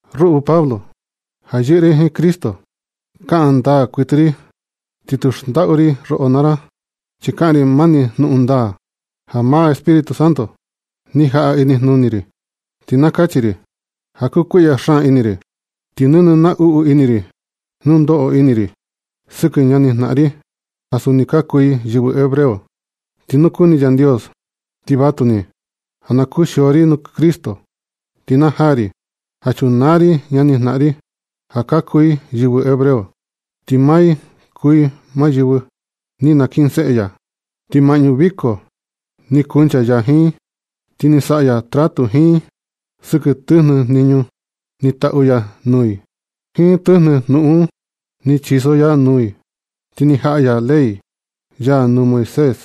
Ruꞌu Pablo, ja yɨꞌɨ ri jiin Cristo kaꞌan ndaa kuɨtɨ ri, ti tu xndaꞌu ri roꞌo naa ra, chi kaꞌan ri mani jnuꞌun ndaa ja maa Espíritu Santo ni jaꞌa inijnuni ri. Ti na kachi ri ja kukuiꞌya xaan ini ri, ti nɨnɨ naꞌnu ini ri nu ndoꞌo ini ri sɨkɨ ñanijnaꞌan ri, ja suni ka kuu i yɨvɨ hebreo. Ti nu kuni Yandios, ti vatuni ja na kuxio ri nuu Cristo ti na naa ri ja chunaa ri ñanijnaꞌan ri, ja ka kuu i yɨvɨ hebreo. Ti maa i kuu maa yɨvɨ ni nakinseꞌe ya. Ti maꞌñu viko ni kancha ya jiin i, ti ni saꞌa ya trato jiin i sɨkɨ tɨjnɨ jniñu ni taꞌu ya nuu i jiin tɨjnɨ jnuꞌun ni chiso ya nuu i. Ti ni jaꞌa ya ley ya nuu Moisés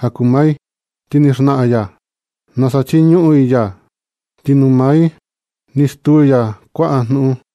ja kuu maa i. Ti ni xnaꞌan ya nasa chiñuꞌun i ya, ti nuu maa i ni stuu ya kuaꞌa jnuꞌun.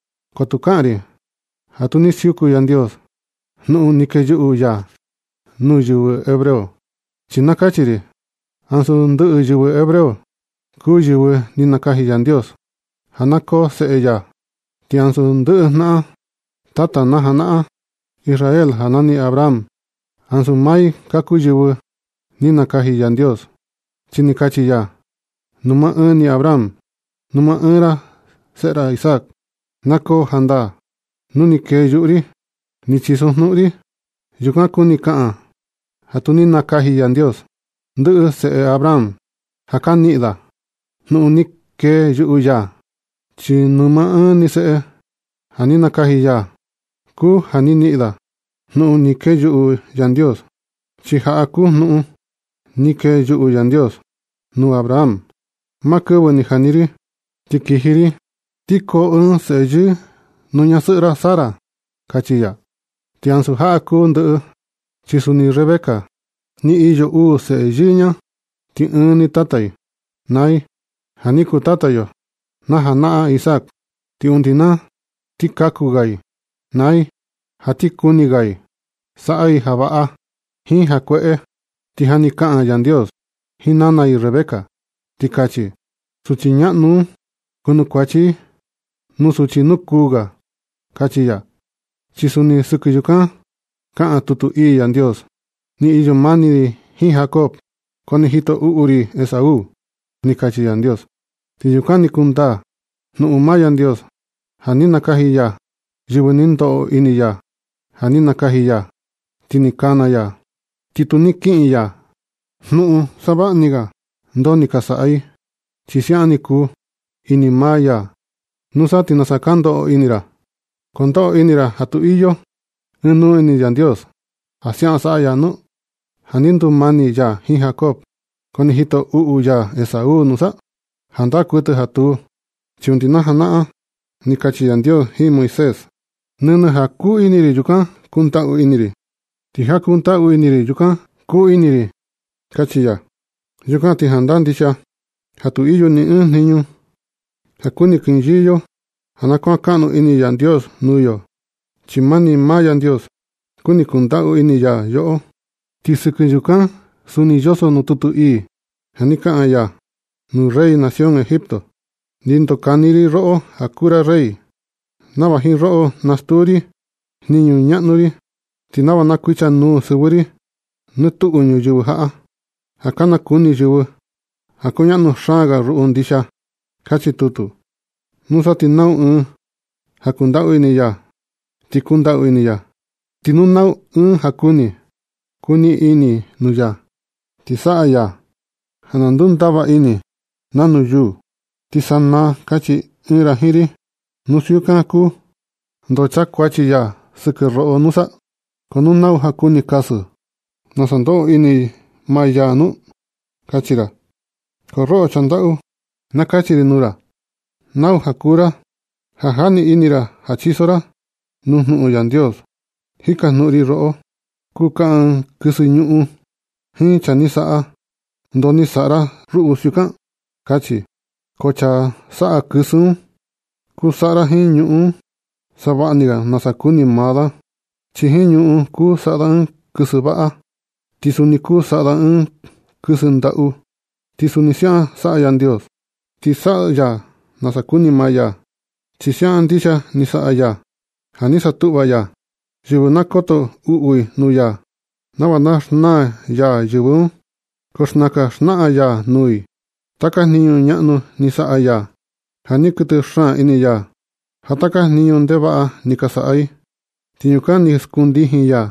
Ko tu kaꞌan ri ja tu ni siuku Yandios jnuꞌun ni keyuꞌu ya nuu yɨvɨ hebreo. Chi na kachi ri ja ansu ndɨꞌɨ yɨvɨ hebreo kuu maa yɨvɨ ni nakaji Yandios ja na koo seꞌe ya. Ti ansu ndɨꞌɨ jnaꞌan tata na janaꞌan Israel ja nani Abraham, ansu maa i ka kuu yɨvɨ ni nakaji Yandios, chi ni kachi ya nuu maa ɨɨn ni Abraham: “Nuu maa ɨɨn ni seꞌe ra Isaac na koo jnaꞌan da nuu ni keyuꞌu ri ni chisojnuꞌun ri.” Yukan kuni kaꞌan ja tu ni nakaji Yandios ndɨꞌɨ seꞌe Abraham ja ka niꞌin da jnuꞌun ni keyuꞌu ya, chi nuu maa ɨɨn ni seꞌe ja ni nakaji ya kuu ja ni niꞌin da jnuꞌun ni keyuꞌu Yandios. Chi jaꞌa kuu jnuꞌun ni keyuꞌu Yandios nuu Abraham: “Maa kɨvɨ ni jani ri ti kiji ri ti koo ɨɨn seꞌe yɨɨ nuu ñasɨꞌɨ ra Sara”, kachi ya. Ti ansu jaꞌa ni kuu ndɨꞌɨ, chi suni Rebeca ni iyo uu seꞌe yɨɨ ña, ti ɨɨn ni tata i naa i, ja ni kuu tata yo na janaꞌan Isaac. Ti undi na ti kaku ga i naa i, ja ti kuni ga i saꞌa i ja vaꞌa jiin ja kueꞌe, ti ja ni kaꞌan Yandios jiin nana i Rebeca, ti kachi: “Suchi ñaꞌnu un kunukuachi i nuu suchi nukuu ga”, kachi ya. Chi suni sɨkɨ yukan kaꞌan tutu ii Yandios: “Ni iyo mani ri jiin Jacob, ko ni jito uꞌu ri Esaú”, ni kachi Yandios. Ti yukan ni kundaa jnuꞌun maa Yandios ja ni nakaji ya yɨvɨ ni ndoꞌo ini ya, ja ni nakaji ya ti ni kana ya, ti tu ni kiꞌin ya jnuꞌun savaꞌa ni ga ndoo ni ka saꞌa i, chi siaꞌan ni kuu ini maa ya. ¿Nusa ti nasa ka ndoꞌo ini ra? ¿Ko ndoꞌo ini ra ja tu iyo ɨɨn nuu ini Yandios ja siaꞌan saꞌa ya nu? ¿Ja ni ndumani ya jiin Jacob, ko ni jito uꞌu ya Esaú, nusa? ¡Jandaa kuɨtɨ ja tuu! Chi undi na janaꞌan ni kachi Yandios jiin Moisés: “Nɨnɨ ja kuu ini ri yukan kundaꞌu ini ri, ti ja kundaꞌu ini ri yukan kuu ini ri”, kachi ya. Yukan ti jandaa ndixia ja tu iyo ni ɨɨn jniñu ja kuni kinyɨɨ yo ja na kuan kaꞌnu ini Yandios nuu yo, chi mani maa Yandios kuni kundaꞌu ini ya yoꞌo. Ti sɨkɨ yukan suni yoso nuu tutu ii ja ni kaꞌan ya nuu rey nación Egipto: “Ni ndokani ri roꞌo ja na kuu ra rey nava jiin roꞌo na stuu ri jniñu ñaꞌnu ri, ti nava na kuichanuu sɨvɨ ri nɨ tuꞌu ñuyɨvɨ jaꞌa, ja ka nakuni yɨvɨ ja kuñaꞌnu xaan ga ruꞌu ndixia”, kachi tutu. Nusa ti nau ɨɨn ja kundaꞌu ini ya, ti kundaꞌu ini ya. Ti nu na ɨɨn ja kuni kuniꞌin ini nuu ya, ti saꞌa ya ja na ndundava ini nanu yuu. Ti sanaa ti kachi ɨɨn ra jiin ri: “Nu siukan kuu, ¿ndo chakuachi ya sɨkɨ yo nusa? ¿Ko nau ja kuni kasɨ nasa ndoꞌo ini maa ya nu”? kachi ra. ¡Ko roꞌo chaa ndaꞌu! Na kachi ri nuu ra: “¡Nau ja kuu ra ja jani ini ra ja nachiso ra nuu jnuꞌun Yandios!” Jikajnuꞌun ri roꞌo: Kuu kaꞌan ɨɨn kɨsɨ ñuꞌun jiin chaa ni saꞌa: “¿Ndoo ni saꞌa ra ruꞌu siukan”? kachi. Ko chaa saꞌa kɨsɨ un kuni saꞌa da jiin ñuꞌun un savaꞌa ni ga nasa kuni maa da, chi jiin ñuꞌun saꞌa da ɨɨn kɨsɨ vaꞌa, ti suni kuu saꞌa da kɨsɨ ndaꞌu. Ti suni siaꞌan saꞌa Yandios, chi saꞌa ya nasa kuni maa ya. Chi siaꞌan ndixia ni saꞌa ya ja ni satuꞌva ya yɨvɨ ja na koto uꞌu i nuu ya, nava na xnaa ya yɨvɨ un. Ko xnakan xnaꞌan ya nuu i taka jniñu ñaꞌnu ni saꞌa ya, ja ni kuɨtɨ xaan ini ya jiin taka jniñu ndevaꞌa ni ka saꞌa i. Ti yukan ni skun ndijin ya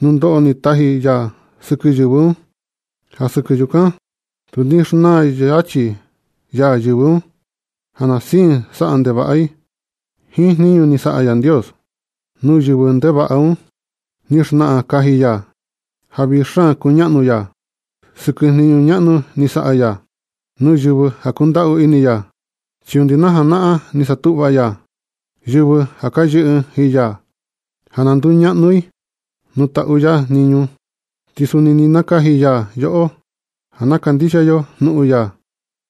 nunoꞌo ni taji ya sɨkɨ yɨvɨ un. Ja sɨkɨ yukan tu ni xnaa yachi ya yɨvɨ un, ja na siin saꞌa ndevaꞌa i. Jiin jniñu ni saꞌa Yandios nuu yɨvɨ ndevaꞌa un, ni xnaꞌan kaji ya ja vii xaan kuñaꞌnu ya sɨkɨ jniñu ñaꞌnu ni saꞌa ya nuu yɨvɨ ja kundaꞌu ini ya. Chi undi najanaꞌan ni satuꞌva ya yɨvɨ ja ka yɨꞌɨ i jiin ya, ja na nduñaꞌnu i nuu taꞌu ya jniñu. Ti suni ni nakaji ya yoꞌo ja na kandixia yo jnuꞌun ya,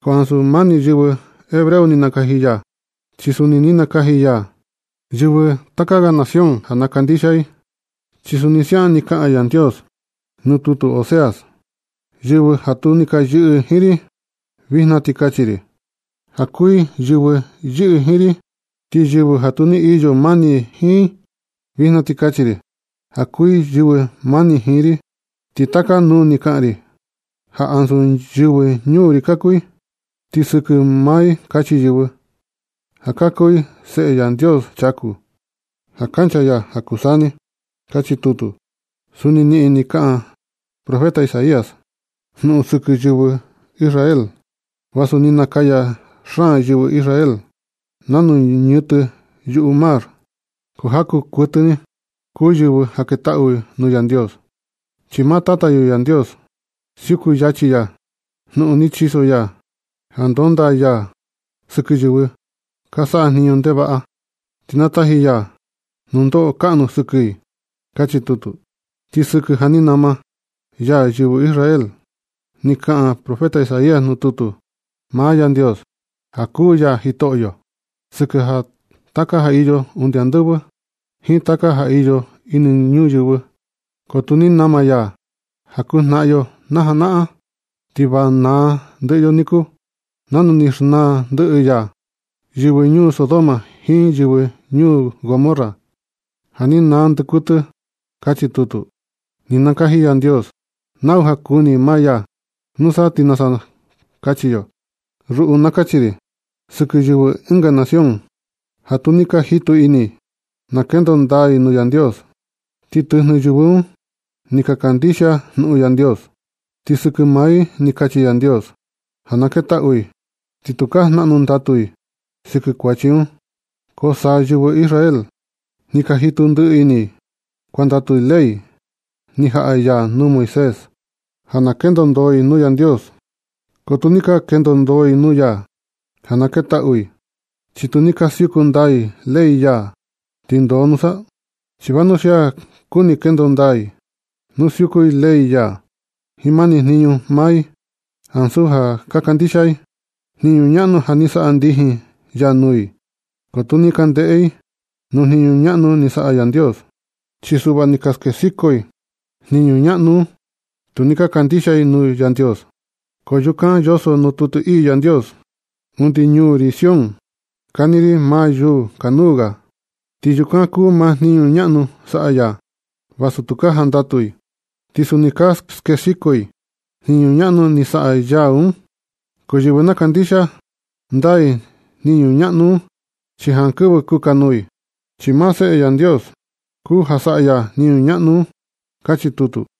ko ansu mani yɨvɨ hebreo ni nakaji ya, chi suni ni nakaji ya yɨvɨ taka ga nación ja na kandixia i. Chi suni siaꞌan ni kaꞌan Yandios nuu tutu Oseas: Yɨvɨ ja tu ni ka yɨꞌɨ jiin ri, vijna ti kachi ri ja kuu i yɨvɨ yɨꞌɨ jiin ri. Ti yɨvɨ ja tu ni iyo mani ri jiin, vijna ti kachi ri ja kuu i yɨvɨ mani jiin ri. Ti taka nuu ni kaꞌan ri ja ansu yɨvɨ ñuu ri ka kuu i. Ti sɨkɨ maa i kachi yɨvɨ ja ka kuu i Seꞌe Yandios chaku, ja kancha ya ja kuu saa ni. Kachi tutu. Suni niꞌin ni kaꞌan profeta Isaías jnuꞌun sɨkɨ yɨvɨ Israel: “Vasu ni nakaya xaan seꞌe yɨvɨ Israel nanu ñɨtɨ yuꞌu mar, ko ja kuu kuɨtɨ ni kuu yɨvɨ ja ketaꞌu nuu Yandios, chi maa Tata yo Yandios siuku yachi ya jnuꞌun ni chiso ya, ja ndonda ya sɨkɨ yɨvɨ ka saꞌa jniñu ndevaꞌa, ti na taji ya nundoꞌo kaꞌnu ga sɨkɨ i”, kachi tutu. Ti sɨkɨ ja ni nama ya yɨvɨ Israel, ni kaꞌan profeta Isaías nuu tutu: Maa Yandios, ja kuu ya Jitoꞌyo sɨkɨ taka ja iyo undi andɨvɨ, jiin taka ja iyo ini ñuyɨvɨ. Ko nu tu ni nama ya jaku jnaꞌan yo na janaꞌan, ti va naa ndɨꞌɨ yo niku, nanu ni xnaa ndɨꞌɨ ya yɨvɨ ñuu Sodoma jiin yɨvɨ ñuu Gomorra, ja ni naa ndɨꞌɨ kuɨtɨ. Kachi tutu. Ni nakaji Yandios nau ja kuni maa ya, ¿nusa ti nasa kachi yo? Ruꞌu na kachi ri sɨkɨ yɨvɨ ɨnga nación, ja tu ni ka jitu ini i na kendo ndaa i nuu Yandios. Ti tɨjnɨ yɨvɨ un, ni ka kandixia i jnuꞌun Yandios. Ti sɨkɨ maa i ni kachi Yandios ja na ketaꞌu i, ti tukaa jnaꞌnu ndatu i sɨkɨ kuachi un. Ko sa yɨvɨ Israel, ni ka jitu ndiꞌi ini i kuandatu i ley ni jaꞌa ya nuu Moisés, ja na kendo ndoo i nuu Yandios. Ko tu ni ka kendo ndoo i nuu ya ja na ketaꞌu i, chi tu ni ka siuku ndaa i ley ya. ¿Ti ndoo nusa? Chi vanuxia ka kuni kendo ndaa i nuu siuku i ley ya jiin mani jniñu maa i, ansu ja kandixia i jniñu ñaꞌnu ni saꞌa ndijin ya nuu i. Ko tu ni ka ndeꞌe i nuu jniñu ñaꞌnu ni saꞌa Yandios. Chi suꞌva ni ka skexiko i jniñu ñaꞌnu un tu ni ka kandixia i Yandios. Ko yukan yoso nuu tutu ii Yandios: Undi ñuu ri Sión kani ri maa yuu kanuu ga, ti yukan kuu maa jniñu ñaꞌnu saꞌa ya, vasu tu ka jandatu i. Ti suni ka skexiko i jniñu ñaꞌnu ja saꞌa ya un. Ko yɨvɨ na kandixia ndaa jniñu ñaꞌnu un, chi jankɨvɨ kukanuu i. Chi maa Seꞌe Yandios kuu ja saꞌa ya jniñu ñaꞌnu un. Kachi tutu.